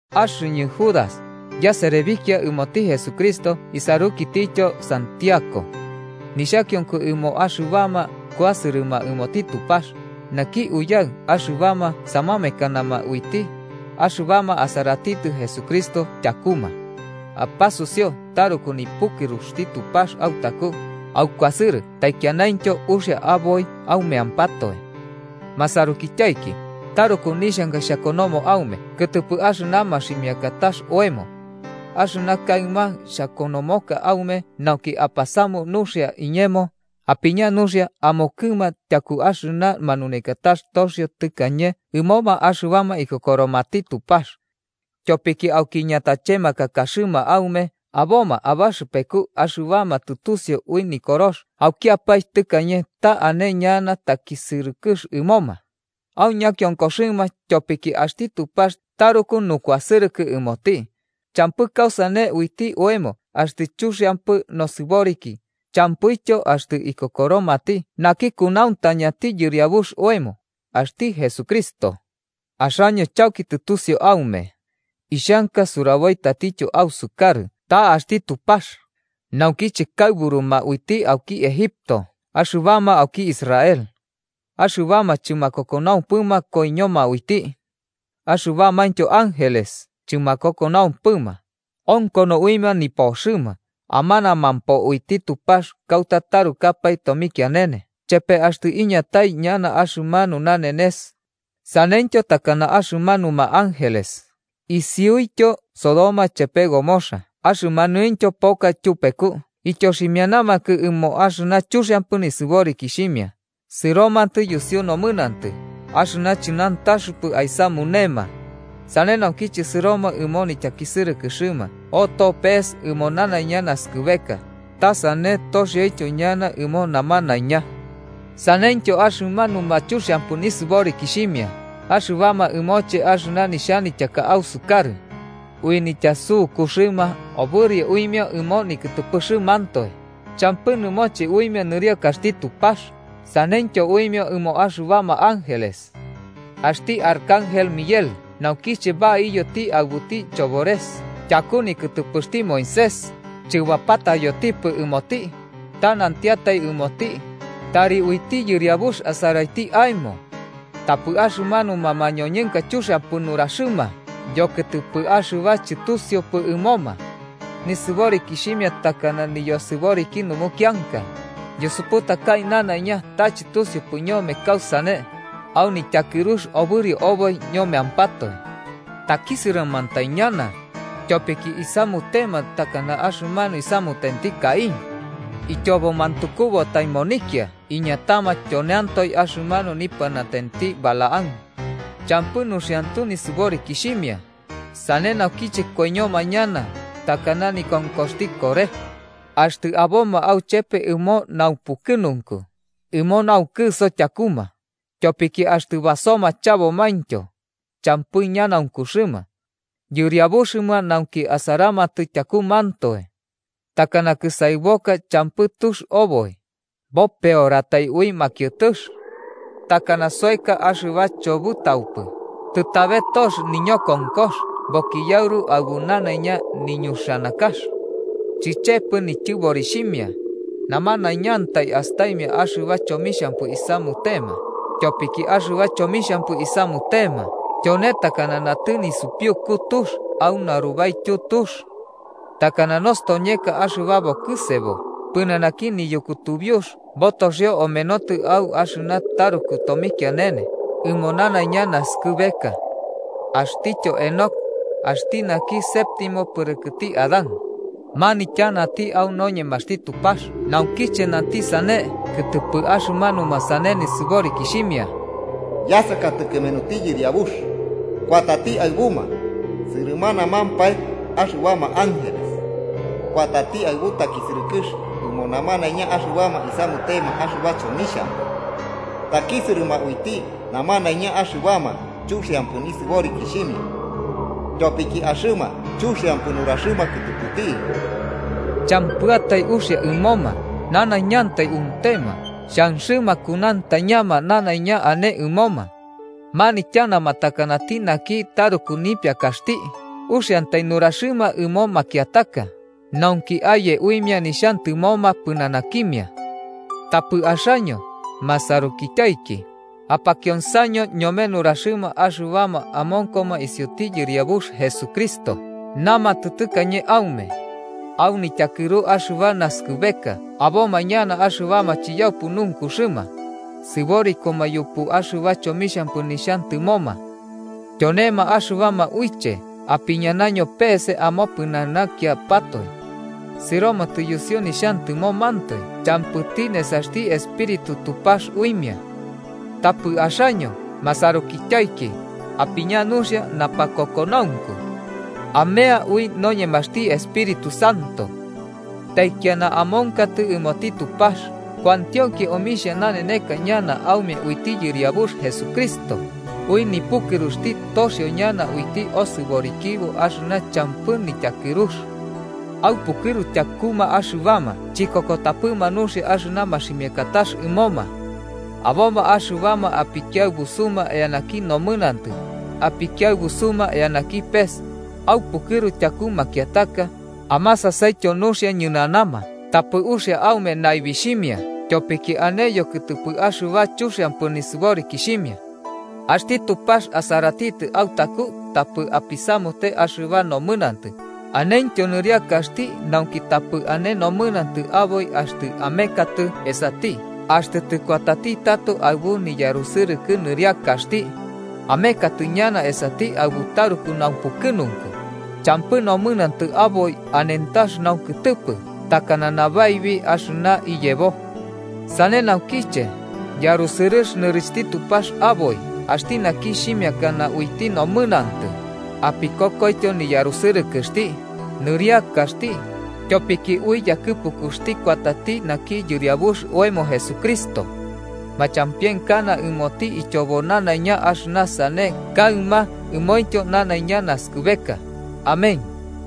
Axɨñɨ Judas, yaserebikia ɨmoti Jesucristo isarukitityo Santiago, nixhakionko ɨmoma axɨbama kuasɨrɨma ɨmoti Tupax, naki Uyaɨ axɨbama samamekanama uiti, axɨbama asaratitɨ Jesucristo tyakuma. Apasusiu taruku nipukɨruxti Tupax autaku, aukuasɨrɨ taikianaintyo uxia aboi aumeampatoe. Masarukityaiki, taruku nixhanka xhakonomo aume kɨtɨpɨ axɨna maximiakatax oemo. Axɨna kaɨma xhakonomoka aume nauki apasamu nuxia iñemo, apiña nuxia amokɨma tyaku axɨna manunekatax toxio tɨkañe ɨmoma axɨbama ikokoromati Tupax. Tyopiki auki ñatachemakakaxɨma aume aboma abaxɨpeku axɨbama tɨtusiu ui Nikorox aukiapae tɨkañe ta ane ñana takisɨrɨkɨx ɨmoma. Au ñakionkoxɨma, tyopiki axti Tupax taruku nukuasɨrɨkɨ ɨmoti, champɨ kausane uiti oemo axtɨ chuxiampɨ nosɨboriki, champɨityo axtɨ ikokoromati naki kunauntañati Yɨriabux oemo, axti Jesucristo. Axaño chauki tɨtusiu aume, ixhanka suraboi tatityo ausukarɨ ta axti Tupax, naukiche kaɨburuma uiti auki Egipto axɨbama auki Israel, axɨbama chɨmakokonaumpɨma koiñoma uiti. Axɨbamaintyo ángeles chɨmakokonaumpɨma, onkono uimia nipoxɨma, amanamampo uiti Tupax kauta tarukapae tomikianene chepe axtɨ iñatai ñana axɨmanu nanenes ñana. Saneityo takana axɨmanuma ángeles, isiuityo Sodoma chepe Gomorra axɨmaniointyo poka tyupeku ityoximianamakɨ ɨmo axɨna chuxiampɨ nisɨborikixhimia, sɨromatɨ yusiu nomɨnantɨ axɨna chɨnantaxɨpɨ aisamunema. Sane naukiche sɨroma ɨmo nityakisɨrɨkɨxɨma oto pees ɨmo nanaiña naskɨbeka ta sane toxioboityo ñana ɨmo namanaiña. Saneityo axɨmanuma chuxiampɨ nisɨborikixhimia, axɨbama ɨmoche axɨna nixhanityaka ausukarɨ. Ui nityasukuxɨma obɨrio uimia ɨmo nikɨtɨpɨxɨmantoe, champɨ nɨmoche uimia nɨriakaxti Tupax saneityo uimia ɨmo axɨbama ángeles. Axti arcángel Miguel, naukiche baiyoti aɨbuti chobores tyaku nikɨtɨpɨxti Moisés, chɨbapataiyoti ɨmoti, ta nantiatai ɨmoti: “¡Tari uiti Yɨriabux asaraiti aemo!” Tapɨ axɨmanuma mañoñɨnka chuxiampɨ nuraxɨma yokɨtɨpɨ axɨba chɨtusiupɨ ɨmoma. Nisɨborikixhimia takana niyosɨboriki numukianka, yusuputakai nanaiña ta chɨtusiupɨ ñome kausane, au nityakɨrux obɨrio oboi ñomeampatoe. ¡Takisɨrɨmantai ñana!, tyopiki isamutema takana axɨmanu isamutenti Caín. Ityobo mantukubatai monikia iñatama tyoneantoe axɨmanu nipɨnatenti Balaam. Champɨ nuxiantu nisɨborikixhimia, sane naukiche koiñoma ñana takana nikonkoxti Coré. Axtɨ aboma auchepe ɨmo naupukɨnunku, ɨmo naukɨso tyakuma, tyopiki axtɨ basoma chabomaintyo, champɨ ñanaunkuxɨma. Yɨriabuxɨma nauki asaramatɨ tyakumantoe. Takana kɨsaɨboka champɨ tux oboi, bopeoratai ui makiɨtɨx. Takana soeka axɨba chobɨtaupɨ, tɨtabe tox niñokonkox bokiyauru aɨbu nanaiña niñuxanakax. Chichepɨ nityɨborixhimia. Namanaiñantai astaimia axɨba chomixhampɨ isamutema, tyopiki axɨba chomixhampɨ isamutema tyone takana natɨ nisupiuku tux au narubaityu tux. Takana nostoñeka axɨba bokɨsebo pɨnanaki niyukutubiux botoxio amenotɨ au axɨna taruku tomikianene ɨmo nanaiña naskɨbeka. Axtityo Henoc, axti naki séptimo pɨrɨkɨti Adán, manityanati au noñemaxti Tupax naukiche nanti sane kɨtɨpɨma axɨmanuma sane nisɨborikixhimia: “Yasakatɨ kɨmenuti Yɨriabux, kuatati aɨbuma sɨrɨmanamampae axɨbama ángeles kuatati aɨbu takisɨrɨkɨx ɨmo namanaiña axɨbama isamutema axɨba chomixhampɨ. Takisɨrɨma uiti namanaiña axɨbama chuxiampɨ nisɨborikixhimia tyopiki axɨma chomixhampɨ nuraxɨma kɨtɨpɨti.” Champɨatai uxia ɨmoma, nanaiñantai untema xhanxɨma kunauntañama nanaiña ane ɨmoma. Manityanama takanati naki taruku nipiakaxti, uxiantai nuraxɨma ɨmo makiataka nauki aye uimia nixhantɨmoma pɨnanakimia. Tapɨ axaño, masarukityaiki, apakionsaño ñome nuraxɨma axɨbama amonkoma isiuti Yɨriabux Jesucristo namatɨ tɨkañe aume: “Au nityakɨru axɨba naskɨbeka aboma ñana axɨbama chiyaupɨ nunkuxɨma, sɨborikoma yupu axɨba chomixhampɨ nixhantɨmoma.” Tyonema axɨbama uiche apiñakaño peese amopɨnanakiapatoe. Sɨromatɨ yusiu nixhantɨmomantoe champɨti nesaxti Espíritu Tupax uimia. Tapɨ axaño, masarukityaiki, apiña nuxia napakokonaunku. Amea ui noñemaxti Espíritu Santo. Taikiana amonkatɨ ɨmoti Tupax kuantionki omixhia naneneka ñana aume uiti Yɨriabux Jesucristo, ui nipukɨruxti, toxio ñana uiti osɨborikibo axɨna champɨ nityakɨrux. Aupukɨru tyakuma axɨbama chikokotapɨma nuxia axɨna maximiakatax ɨmoma. Aboma axɨbama apikiaɨbusuma eanaki nomɨnantɨ, apikiaɨbusuma eanaki pes, aupukɨru tyaku makiataka, amasasaityo nuxia ñɨnanama tapɨ uxia aume naibixhimia tyopiki ane yokɨtɨpɨ axɨna chuxianpɨ nisɨborikixhimia. Axti Tupax asaratitɨ autaku tapɨ apisamute axɨba nomɨnantɨ, anentyo nɨriakaxti nauki tapɨ ane nomɨnantɨ aboi axtɨ amekatɨ esati axtɨ tɨkuatati tato aɨbu niyarusɨrɨkɨ nɨriakaxti. Amekatɨ ñana esati aɨbu taruku naupukɨnunku, champɨ nomɨnantɨ aboi anentax naukɨtɨpɨ takana nabaibi axɨna iyebo. Sane naukiche, yarusɨrɨx nɨrixhti Tupax aboi axti naki xhimiakana uiti nomɨnantɨ, apikokoityo niyarusɨrɨkɨxti, nɨriakaxti, tyopiki ui yakɨpukuxti kuatati naki Yɨriabux oemo Jesucristo. Machampienkana ɨmoti ityobo nanaiña axɨna sane kaɨma ɨmointyo nanaiña naskɨbeka. Amén.